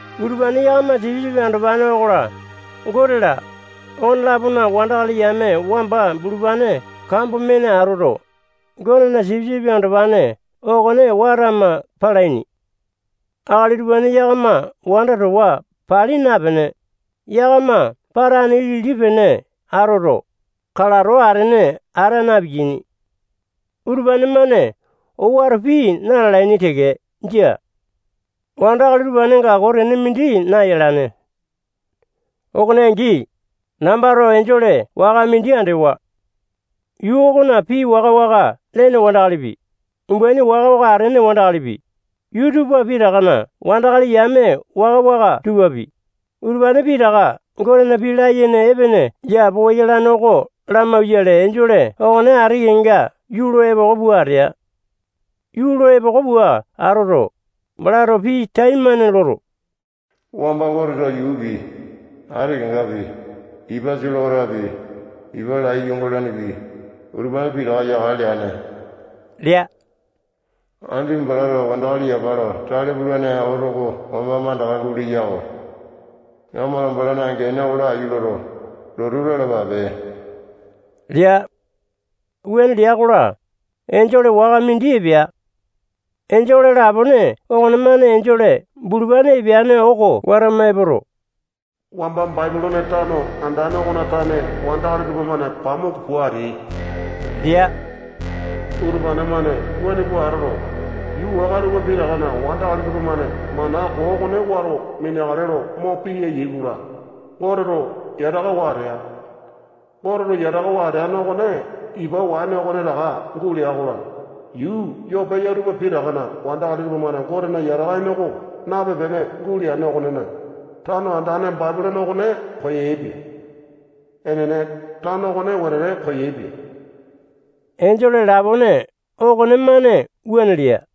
Utupane yakama Sipisipi Andopane okola, Gote-la, okone-lapona wandakali yame wamba bulupane kambo mene atoto, Gotena Sipisipi Andopane okone watama palaini. Akali utupane yakama wanda towa pali napene, yakama patane ilili pene atoto, kalato atene ata na-piyaini. Utupane-mane owato pii na-lalaini teke. Jia. Wandakali utupanenga koo tene mindi nayalane. Okone angi, nambato enjole waka mindi andewa. Yuu okona pii waka-waka lene wandakalipi, umbaini waka-waka atene wandakalipi, yuu tupa pitakana wandakali yame waka-waka tupapi, utupane pitaka Gotena pii layene epene yapowa yalane oko lamauwayale, enjole okone ati kenga yuu lo epoko pua atea. Yuu lo epoko pua atoto, balato pii taimane loto, wamba Goteto yuupi, ati kengapi, ipa solewatapi, ipa lai yungalanepi, utupane pitaka yakale leane lea. Andipa balato wandakali yapa lo tale pulane oto oko wamba mandaka guleya-ko. Yakamato balana gene oko laiyu loto, lotu lalapape lea. Wuane lea-kola, enjole waka mindi epea. Enjole lapone okonemane enjole bulupane epeane oko watama epoto, wamba Bapilone tano andane okona tane wandakali tupamane pamuku pua ateai lea. Utupane-mane wuane pua atoto, yuu waka tupa pitakana wandakali tupamane mana koo okone wato mineakale lo mo piya ya-kola, Goteto yatakawa atea. Goteto yatakawa ateane okone ipa waene okonetaka gulea-kola, yuu yoo peya tupa pitakana wandakali tupamane Gotena yataka ene oko nape-pene guleane okonena, tano andane Bapilone okone koyaepia. Enene, tano okone wetete koyaepia. Enjole lapone okonemane wuane lea.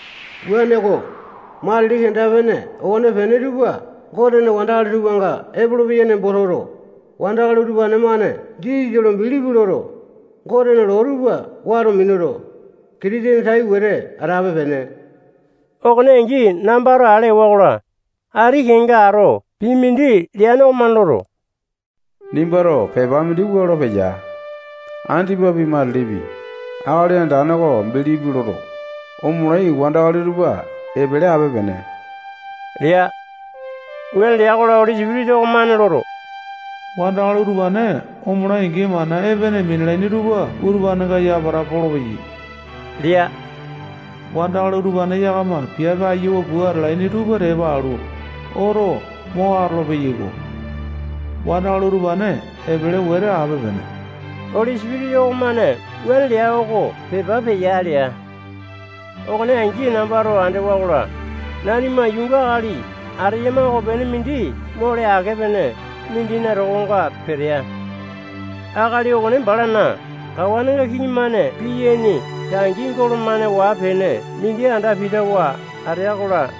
Wuaneko, matili kenda-pene okonepene tupa Gotena wandakali tupanga epolopeya nembo toto, wandakali utupane-mane Jisasa lo bilipi loto, Gotena loo tupa wato minuto, Kitisene tai wete atape-pene. Okone angi nambato ale ewa-kola, ati kenga ato pii mindi leane okomane loto, nimbato pepa mindi wua lo peya: Andipapi, matili-matilipi, Akali Andane oko bilipi loto, omolai wandakali tupa epele ape-pene lea. Wuane lea-kola, Oli Sipitisa okomane loto, wandakali utupane omolai-angi, mana epene minalaini tupa utupanenga yapata polopeyai lea. Wandakali utupane yakama piape ayiawa pua atalaini tupa tepa alu, oto mo atolo-peyaiko. Wandakali utupane epele wete ape-pene. Oli Sipitisa okomane wuane leya oko pepa peya lea. Okone angi nambato andewa-kola, nanima yuunga akali ateyama okonepene mindi mole ake-pene mindina tokonga petea. Akali okone balana kawanenga kiŋi-mane piyaini tangi golo-mane waa-pene mindi anda pitawa atea-kola,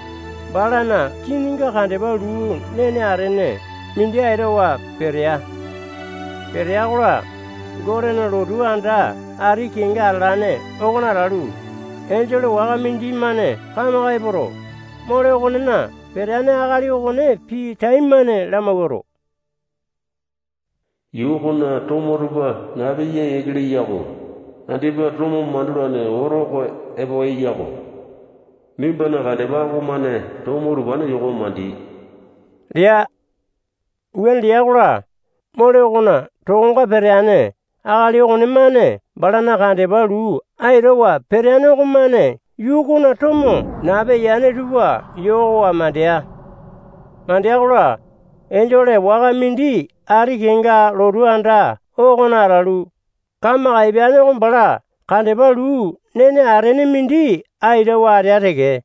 balana kininga kandepa luu nene atene mindi aitawa petea. Petea-kola, Gotena lotu anda ati kenga atalane okona atalu, enjole waka mindimane kamaka epoto, mole okonena peteane akali okone pii taimane lamawuato, yuu okona tomo tupa nape yaa yiake leya-ko. Andipa tomo mandulane oto oko epo eya-kola, nimbana kandepa okomane tomo utupane yokowa mandi lea. Wuane lea-kola, mole okona tokonga peteane akali okonemane balana kandepa luu aitawa peteane okomane yuu okona tomo nape yane tupa yokowa mandea. Mandea-kola, enjole waka mindi ati kenga lotu anda okona atalu, kamaka epeane oko bala kandepa luu nene atene mindi aitawa atea teke.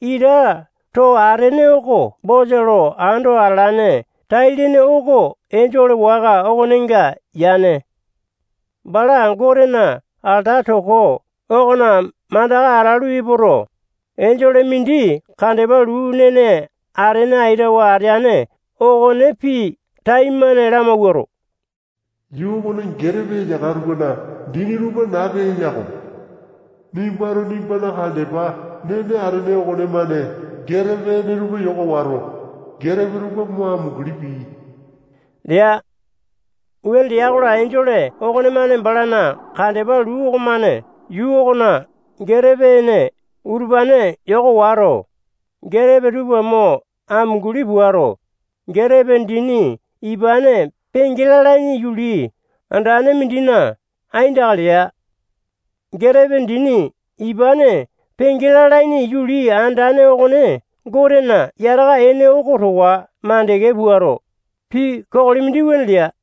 Ita too atene oko bosa lo ando atalane tai-lene oko enjole waka okonenga yane. Bala Gotena alata toko okona mandaka atalu epoto, enjole mindi kandepa luu nene atene aitawa ateane okone pii taimane lamawuato, yuu okona getepe eyaka tupana dini tupa nape eya-ko. Nimbato nimbana kandepa nene atene okonemane getepe ene tupa yoka wato, getepe tupa mo amunguli pii lea. Wuane lea-kola, enjole okonemane balana kandepa luu okomane yuu okona getepe ene utupane yoka wato, getepe tupa mo amunguli puato, getepe dini ipane penge lalaini yuli andane mindina aindaka lea. Getepe dini ipane penge lalaini yuli andane okone Gotena yataka ene oko towa makande puato, pii kokoli mindi wuane lea.